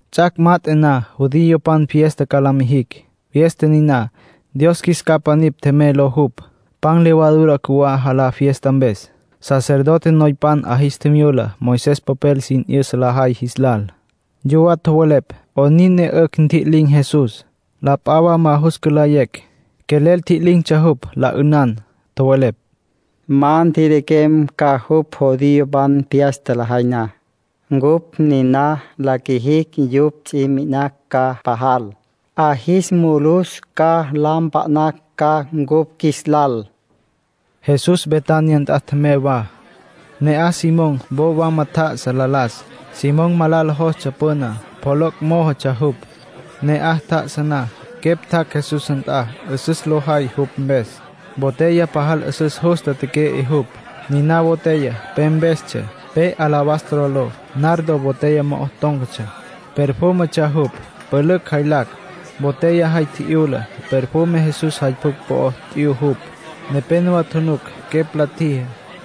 Ts'ac' mat'e na judiopan fiesta ca la mijictsja. Fiesta niná “Dios Qjuis Capa Nipj Tjemey” ló jupj. Pan levadura cjuwá jalá fiesta mpes. Sacerdote noypan 'a jis tjimyula Moisés popel sin 'yüsa lajay jis lal. Yuwá tjowelepj 'onin ne 'ücj ntji'lin̈ Jesús, la p'a wa ma jus cülayecj. Quelel tji'lin̈tsja jupj, la 'ünan. Tjowelepj: “Ma ntjiliquem ca jupj judiopan fiesta lajay na. Cupj niná la qjuijicj, yupj ts'i mi'inacj ca pajal. 'A jis mulus ca, la mpa'nacj ca cupj qjuilal,” nin tjowelepj yupj. Jesús Betania nt'a tjemey wa. Ne'aj Simón wo wama tjá'asa la las. (Simón malala jostsja püná. Pjoloc' mójotsja jupj.) Ne'aj tjá'asa na, quepj tjac' Jesús nt'a 'üsüs lo jay jupj mpes. Botella pajal 'üsüs justa teque'e jupj. Niná botella pe mpestsja, pe alabastro ló. Nardo botella mo'o tón̈catsja. Perfúmetsja jupj, pülücj jaylacj. Botella jay tji'yula, perfume Jesús jay pjucj po'o t'yu jupj. Nepénowa tjunuc quepj la tjijá.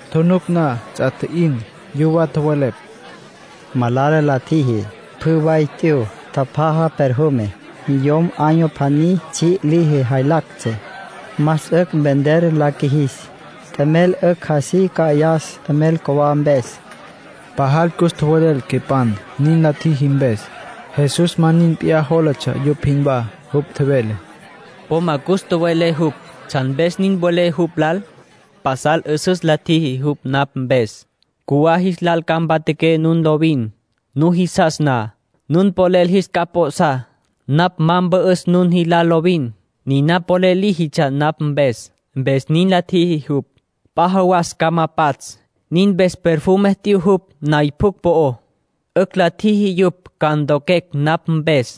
Tjunuc na, ts'a tji'in. Yuwá tjowelepj: —Malala la tjiji. Pjü way t'yu. Tjapjaja perfume. Yom año pjaní tsji' liji jaylactsja. Más 'ücj vender la qjuijis, t'emel 'ücj así cü'ayas t'emel cjuwá mpes. Pajal cus tjowelel quepan nin la tjiji mpes. Jesús ma nin p'iyá jólatsja yupj jinwá. Jupj tjevele: —Po ma cus tjowe'lé jupj. ¿Tsjan mpes nin welé jupj lal? Pasal 'üsüs la tjiji jupj napj mpes. Cjuwá jis lal ca mpatjaqué nun lovin. Nujisas na, nun polel jis capj p'o'sá. Napj ma ca mpü'üs nun jilal lovin. Niná polel líjitsja napj mpes, mpes nin la tjiji jupj. P'a jawas ca ma pats'. Nin mpes perfume t'yu jupj nay pjucj po'ó. 'Ücj la ntjiji yupj ca ntoquecj napj mpes.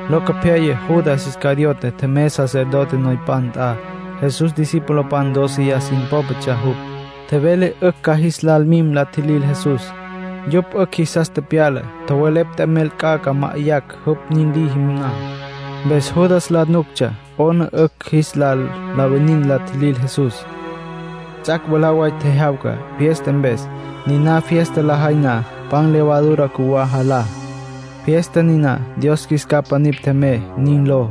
Locopyaya Judas Iscariote tjemey sacerdote noypan nt'a. Jesús discipulopan dóceya sin pópatsja jupj. Tjevele 'ücj ca jis lal mim la tjilil Jesús. Yupj 'ücj jisas tepyala. Tjowelepj t'emel ca ma'ayacj jupj nin liji na. Mpes Judas la nuctsja 'ona 'ücj jis lal la winin la tjilil Jesús. Ts'ac' mwalá way tjejyawca fiesta mpes. Niná fiesta lajay na, pan levadura cjuwá jalá. Fiesta niná “Dios Qjuis Capa Nipj Tjemey” nin ló.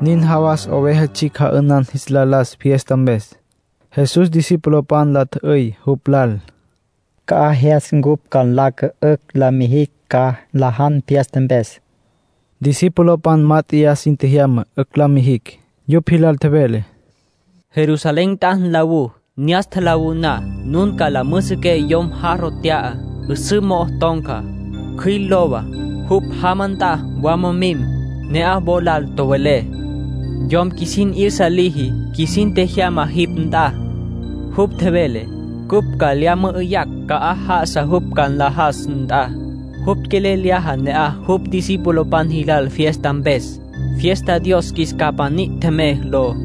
Nin jawas oveja tsjicj ja'ünan jis la las fiesta mpes. Jesús discipulopan la tjü'üy jupj lal: —¿Ca'aj jyas cupj ca nlaca 'ücj la mijicj ca nlajan fiesta mpes? Discipulopan mát'eya sin tjejyama 'ücj la mijicj. Yupj jilal tjevele: —Jerusalén nt'a nlawú. Ne'as tjalawú na, nun la müjüsüqué yomen jarro t'ya, 'üsǘ mo'o ton̈ca. Cjüil lowa. Jupj jama nt'a wama mim. Ne'aj wo lal tjowelé: ‘Yom qjuisin 'yüsa liji qjuisin tjejyama jipj nt'a. Jupj tjevele cupj ca lya mü'üyacj ca'aj já'asa jupj ca nlajas nt'a. Jupj quelel lyaja ne'aj jupj discipulopan jilal fiesta mpes, fiesta “Dios Qjuis Capa Nipj Tjemey” ló.’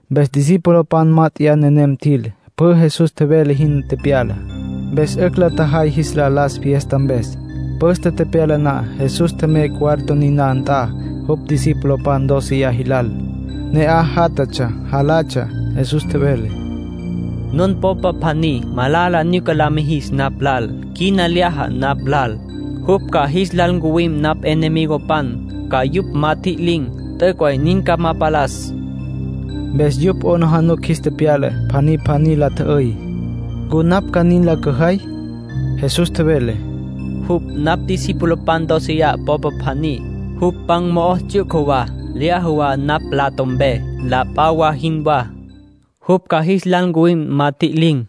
Mpes discipulopan mát'eya nenem tjil. Pjü Jesús tjevele jin tepyala. Mpes 'ücj la tjajay jis la las fiesta mpes. Püste tepyala na, Jesús tjemey cuarto niná nt'a jupj discipulopan dóceya jilal. Ne'aj játjatsja, jalatsja. Jesús tjevele: —Nun popa pjaní malala nyuca la mijis napj lal. Quina lyaja napj lal. Jupj ca jis lal ncuwim napj enemigopan, ca yupj ma tjililin̈. T'üc' way nin ca ma palas —tjevele. Mpes yupj 'aplijila jis tepyala. Pjaní pjaní la tjü'üy: —¿Ncu napj ca nin la cüjay? Jesús tjevele: —Jupj napj discipulopan dóceya popa pjaní. Jupj pan mo'o ts'yuca wa, lyaja wa napj mplato mpe, la p'a wa jinwá. Jupj ca jis lal ncuwim ma tjililin̈.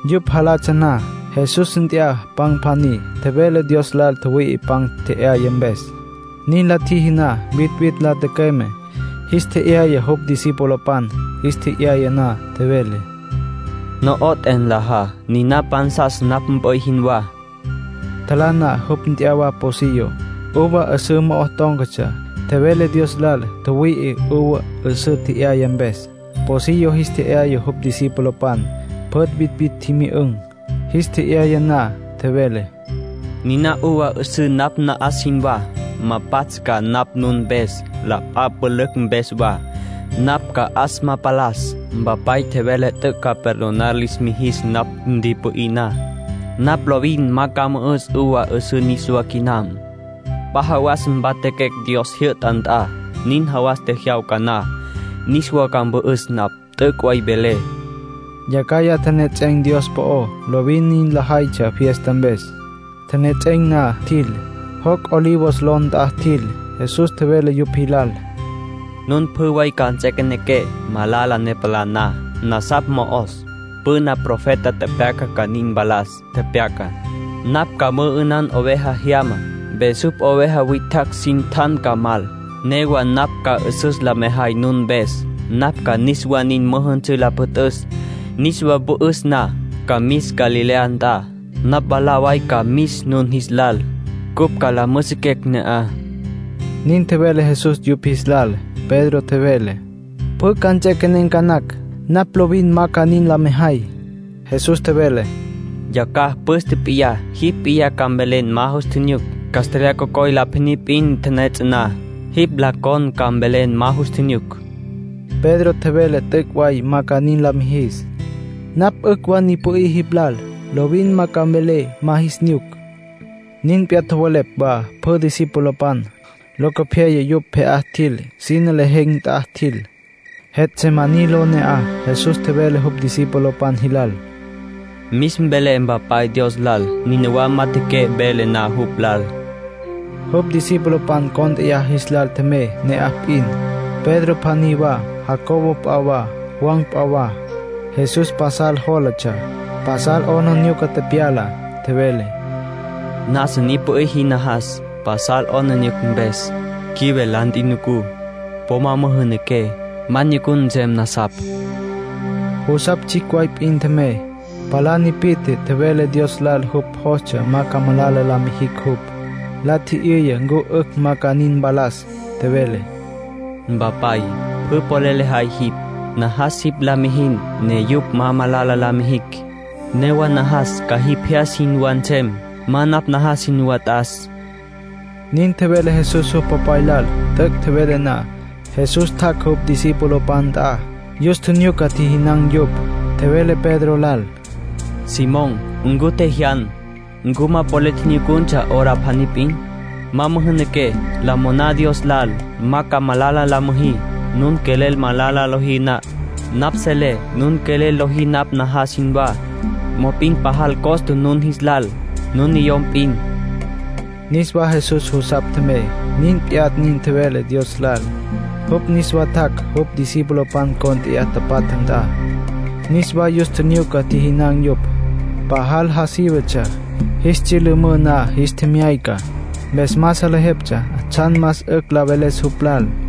Yupj jalatsja na, Jesús nt'ya pan pjaní. Tjevele Dios lal tjüwüi'i pan tje'yaya mpes. Nin la tjiji na vitvitj la tücüeme, jis tje'yaya jupj discipulopan. Jis tje'yaya na, tjevele: —No'oté, nlajá. Niná pansas napj mp'üy jinwá. Tjalá na, jupj nt'ya wa pocillo, uva 'üsǘ mo'o tón̈catsja. Tjevele Dios lal tjüwüi'i uva 'üsǘ tje'yaya mpes. Pocillo jis tje'yaya jupj discipulopan. Pjü vitvitj tjimyü'ün̈. Jis tje'yaya na, tjevele: —Niná uva 'üsǘ napj na'as jinwá. Ma pats' ca napj nun mpes, la p'a pülücj mpes wa. Napj ca 'as ma palas. Mpapay tjevele t'üc' ca perdonar lis mijis napj ntipü'í na. Napj lovin ma ca mü'üs uva 'üsǘ niswá quinam. P'a jawasa mpatjaquecj Dios jyü'ta nt'a. Nin jawas tjejyawca na, niswa ca mü'üs napj. T'üc' way velé —tjevele jupj. Yacjaya tjenejets'en̈ Dios po'ó. Lovin nin lajaytsja fiesta mpes. Tjenejets'en̈ na, tjil. Joc' Olivos ló nt'a tjil. Jesús tjevele yupj jilal: —Nun pjü way ca nts'equenequé malala ne palá na. Nasapj mo'os. Püna profeta tepyaca ca nin mpalas. Tepyaca: ‘Napj ca mü'ünan oveja jyama, mpes jupj oveja witjacj sin tjan ca mal.’ Newa napj ca 'üsüs la mejay nun mpes. Napj ca niswa nin müjünsǘ la püt'üs. Niswa pü'üs na, ca mis Galilea nt'a. Napj mwalá way ca mis nun jis lal, cupj ca la müjüsüquecj ne'aj —nin tjevele Jesús yupj jis lal. Pedro tjevele: —Pjü ca nts'equenen̈ ca nacj. Napj lovin ma ca nin la mejay. Jesús tjevele: —Yacjaya püste p'iyá jipj p'iyá ca mvelen ma nus nyuc. Castlyaj cocoy la pjaní p'in la tipiya na, jipj la con ca mvelen ma nus nyuc. Pedro tjevele t'üc' way ma ca nin la mijis. —Napj 'ücj wa ni pü'í jipj lal. Lovin ma ca mvelé ma jis nyuc —nin tjevele Pedro. Nin p'iyá tjowelepj wa pjü discipulopan. Locopyaya yupj pje'á tjil. Sine lejen̈ nt'a tjil, Getsemaní ló ne'aj. Jesús tjevele jupj discipulopan jilal: “Mis mvelé Mpapay Dios lal. Nínawa majatjaqué velé na jupj lal.” Jupj discipulopan cónt'eya jis lal tjemey ne'aj p'in. Pedro pjaní wa, Jacobo p'a wa, Juan p'a wa. Jesús pasal jólatsja, pasal 'aplijila tepyala. Tjevele: “Nasa ni pü'í jin najas, pasal 'aplijila mpes. Quive la ntjunucú. Po ma müjünaqué, ma nyucun nsem nasapj.” Jusapj tsjicj way p'in tjemey. Palá tipi'tje, tjevele Dios lal jupj jostsja ma ca malala la mijicj jupj. La tji'yüya ncu 'ücj ma ca nin mpalas. Tjevele: “Mpapay, pjü polel lejay jipj. Najas jipj la mijin ne yupj ma malala la ma jicj. Newa najas ca jipj jyas jinwá nsem. Ma napj najas jinwá t'as”, nin tjevele Jesús jupj Popay lal. T'üc' tjevele na, Jesús tjac' jupj discipulopan nt'a. Yus tjinyuca tjijinan̈ yupj. Tjevele Pedro lal: “Simón, ¿ncu tjejyan? ¿Ncu ma polel nyucuntsja hora pjaní p'in? Ma müjünaqué. La moná Dios lal ma ca malala la müjí, nun quelel malala lojí na. Napj selé nun quelel lojí napj najas jinwá. Mop'in pajal costa nun jis lal, nun niyom p'in”, tjevele jupj. Niswa Jesús jusapj tjemey. Nin p'iyá nin tjevele Dios lal. Jupj niswa tjac' jupj discipulopan cont'e tapatja nt'a. Niswa yus tjinyuca tjijinan̈ yupj. Pajal ja sívetsja. Jis tsyülümǘ na jis tjemyayca, mpes ma salejeptsja tsjan más 'ücj la veles jupj lal.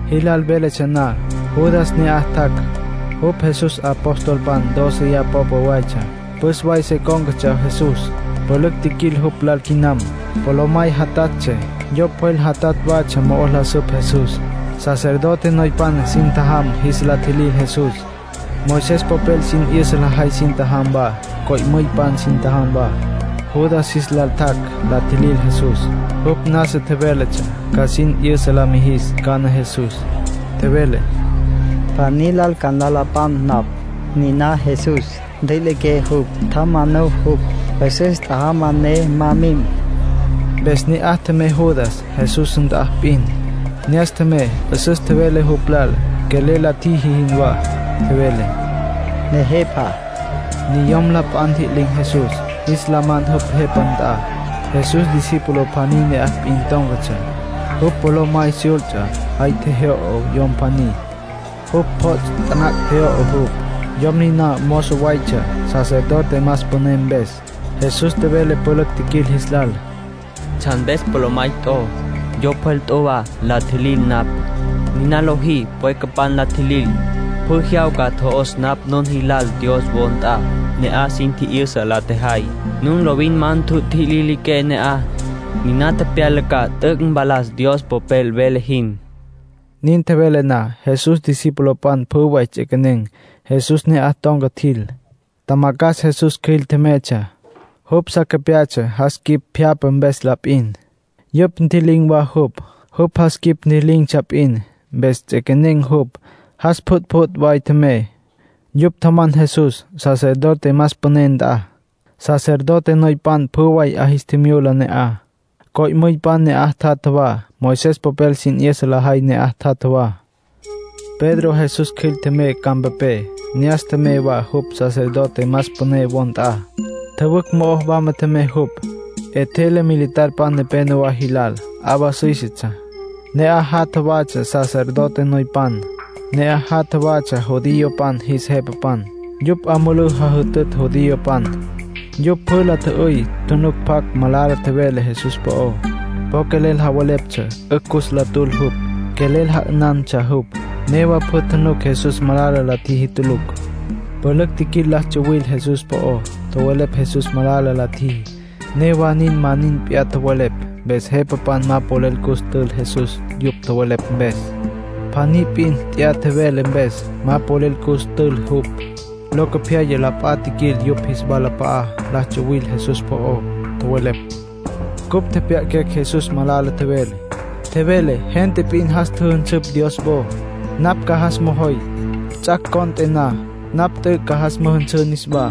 Jilal véletsja na, Judas ne'aj tjac'. Jupj Jesús apostolpan dóceya popa watsja. Püs way se cón̈catsja Jesús. Pülücj tjiquil jupj lal quinam. Polomay jatatsja, yo pjwel jatatj watsja mo'o la süp Jesús. Sacerdote noypan sin tjajam jis la tjilil Jesús. Moisés popel sin 'yüsa lajay sin tjajam wa. Co'müypan sin tjajam wa. Judas jis lal tjac' la tjilil Jesús. Jupj nasa tjevéletsja ca sin 'yüsa la mijis cana Jesús. Tjevele: “Pjaní lal ca la nlapan napj. Niná Jesús. Ntjüiliqué jupj. Tjamanú jupj. 'Üsüs tjajama ne ma mim.” Mpes ne'aj tjemey Judas, Jesús nt'a p'in. Ne'as tjemey, 'üsüs tjevele jupj lal, quelel la tjiji jinwá. Tjevele: —Nejepa. Niyom la p'a ntji'lin̈ Jesús, jis la man jupj jepapan nt'a. Jesús discípulo pjaní ne'aj p'in tón̈catsja. Jupj polomay syults'a. Jay tjejyo'o yom pjaní. Jupj pjots' taná tjejyo'o jupj. Yom niná mozo waytsja sacerdote más püné mpes. Jesús tjevele pülücj tjiquil jis lal: —¿Tsjan mpes polomay t'o, yo pjwel t'o wa la tjilil napj? Niná lojí pwequepj la tjilil. Pjü jyawca tjo'os napj nun jilal Dios wo nt'a. Ne'aj sin tji'yüsa la tjejay. Nun lovin ma ntjutjililiqué ne'aj. Niná tepyala ca t'üc' mpalas Dios Popel vele jin. Nin tjevele na, Jesús discipulopan pjü way ts'equenen̈. Jesús ne'aj ton̈ca tjil. Tjamacjas Jesús cjüil tjemeytsja. Jupj sa capyatsja jas quip pjyapja mpes la p'in. Yupj ntji'lin̈ wa jupj. Jupj jas quip ntji'lin̈tsja p'in. Mpes ts'üequené jupj, jas pjütpjüt' way tjemey. Yupj tjaman Jesús sacerdote más püné nt'a. Sacerdote noypan pjü way 'a jis tjimyula ne'aj. Co'müypan ne'aj tjatja wa, Moisés popel sin 'yüsa lajay ne'aj tjatja wa. Pedro Jesús cjüil tjemey campapé. Ne'as tjemey wa jupj sacerdote más püné wo nt'a. Tjüwücj mo'o wama tjemey jupj. 'Etjele militarpan nepénowa jilal. 'Awa süísetsja. Ne'aj jatja watsja sacerdote noypan. Ne'aj jatja watsja judiopan jis jepapan. Yupj 'a mulú jajütütsja judiopan. Yupj pjü la tjü'üy tjunuc pjacj malala mveles Jesús po'ó. Po quelel javeleptsja 'ücj cus la tül jupj. Quelel ja'ünantsja jupj. Newa pjü tjunuc Jesús malala la tjiji tulucj. Pülücj tjiquil la tsuwil Jesús po'ó. Tjowelepj Jesús malala la tjiji. Newa nin ma nin p'iyá tjowelepj. Mpes jepapan ma polel cus tül Jesús yupj tjowelepj mpes. Pjaní p'in t'ya tjevele mpes, ma polel cus tül jupj. Locopyaya la p'a tjiquil yupj jis walap'a'a la tsuwil Jesús po'ó. Tjowelepj: —Cupj tjepjya'aquecj Jesús malala tjevele. Tjevele: ‘Gente p'in jas tjüjünsüpj Dios wo. Napj ca jas mojoy. Ts'ac' cont'e na, napj t'üc' ca jas müjünsǘ niswá.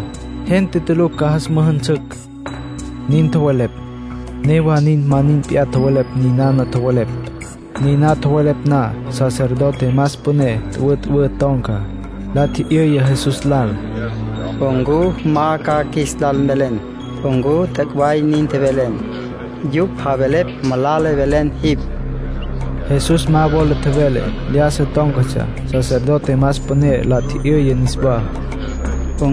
Gente tulucj ca jas müjünsücj’ —nin tjowelepj. Newa nin ma nin p'iyá tjowelepj ninana tjowelepj. Niná tjowelepj na, sacerdote más püné tüwütüwǘ ton̈ca. La tji'yüya Jesús lal: —¿Ncu ma ca qjuis lal mvelen ncu t'üc' way nin tjevelen? Yupj javelepj malala tjevelen jipj. Jesús ma wola tjevele. Lyájasa tón̈catsja. Sacerdote más püné la tji'yüya niswá: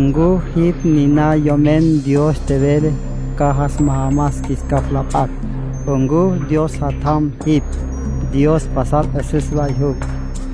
—¿Ncu jipj niná Yomen Dios tjevele ca jas majamas qjuis capj la p'acj? ¿Ncu Dios Jatjam jipj? Dios pasal 'üsüs way jupj.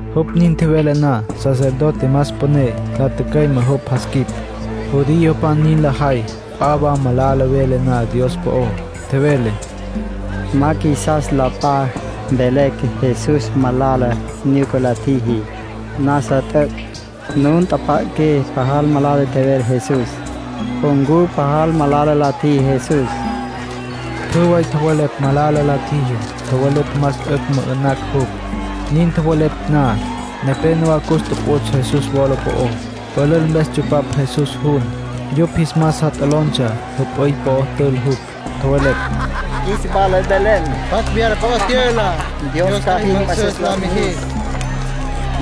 Jupj nin tjevele na, sacerdote más püné la tücüeme jupj jas quip. Judiopan nin lajay p'a wa malala vele na Dios po'ó. Tjevele: —¡Ma qjuisas la p'a mvelecj Jesús malala nyuca la tjiji! ¡Nasa t'üc'! Nun tjapja'aqué pajal malala tjevele Jesús. ¿Ncu pajal malala la tjiji Jesús? Pjü way tjowelepj malala la tjiji. Tjowelepj más 'ücj mü'ü'nacj jupj. Nin tjowelepj na, nepénowa cus tuputs' Jesús wola po'ó. Pülül mpes tsupapj Jesús jun. Yupj jis mas sa lototsja, jüp'üy po'o tül jupj. Tjowelepj: —Qjuis wala mvelen, ¿pjacj wyala po'ó tyüla? ¡Dios ca jin mü'üsüs la mijis!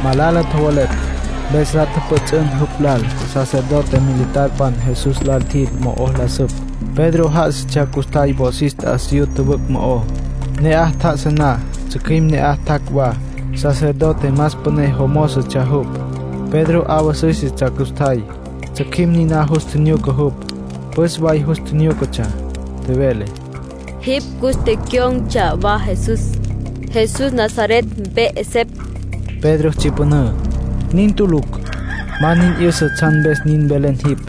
Malala tjowelepj, mpes la tjüpjüts'ün jupj lal. Sacerdote militarpan Jesús lal tjil, mo'o la süp. Pedro já'asatsja custjay wosis t'asiyú tjüwücj mo'ó. Ne'aj tjá'asa na, tsjücjüim ne'aj tjac' wa. Sacerdote más püné jomózotsja jupj. Pedro 'awa süísetsja custjay. Tsjücjüim niná jus tjinyuca jupj, püs way jus tjinyúcatsja. Tjevele: —Jipj cus tecyon̈tsja wa Jesús, Jesús Nazaret mpe 'esepj. Pedro tsyüpünǘ. —Nin tulucj —tjevele—. Ma nin 'yüsa tsjan mpes nin velen jipj.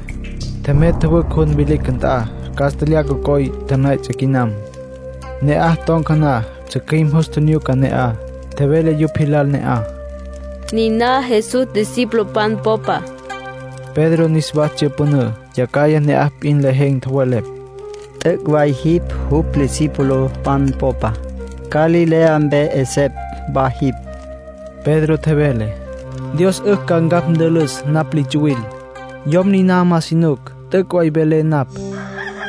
Tjemey tjüwücj jun vilicj nt'a. Castlyaj cocoy la tipiya quinam. Ne'aj ton̈ca na, tsjücjüim jus tjinyuca ne'aj. Tjevele yupj jilal ne'aj: —Niná Jesús discipulopan popa. Pedro niswa tsyüpünǘ. Yacjaya ne'aj p'in lejen̈ tjowelepj: —T'üc' way jipj jupj discipulopan popa. Galilea mpe 'esepj wa jipj. Pedro tjevele: —Dios 'ücj ca ncapj ntülüs napj li tsuwil. Yom niná ma si nuc. T'üc' way velé napj.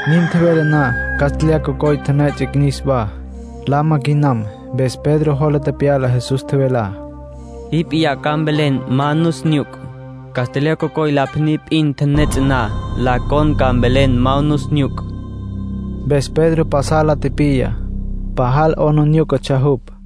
Nin tjevele na castlyaj cocoy la tipiya niswá, lama quinam. Mpes Pedro jola tepyala Jesús tjevelá: “Jipj p'iyá ca mvelen ma nus nyuc. Castlyaj cocoy la pjaní p'in la tipiya na, la con ca mvelen ma nus nyuc.” Mpes Pedro pasal la tipiya, pajal 'aplijílatsja jupj.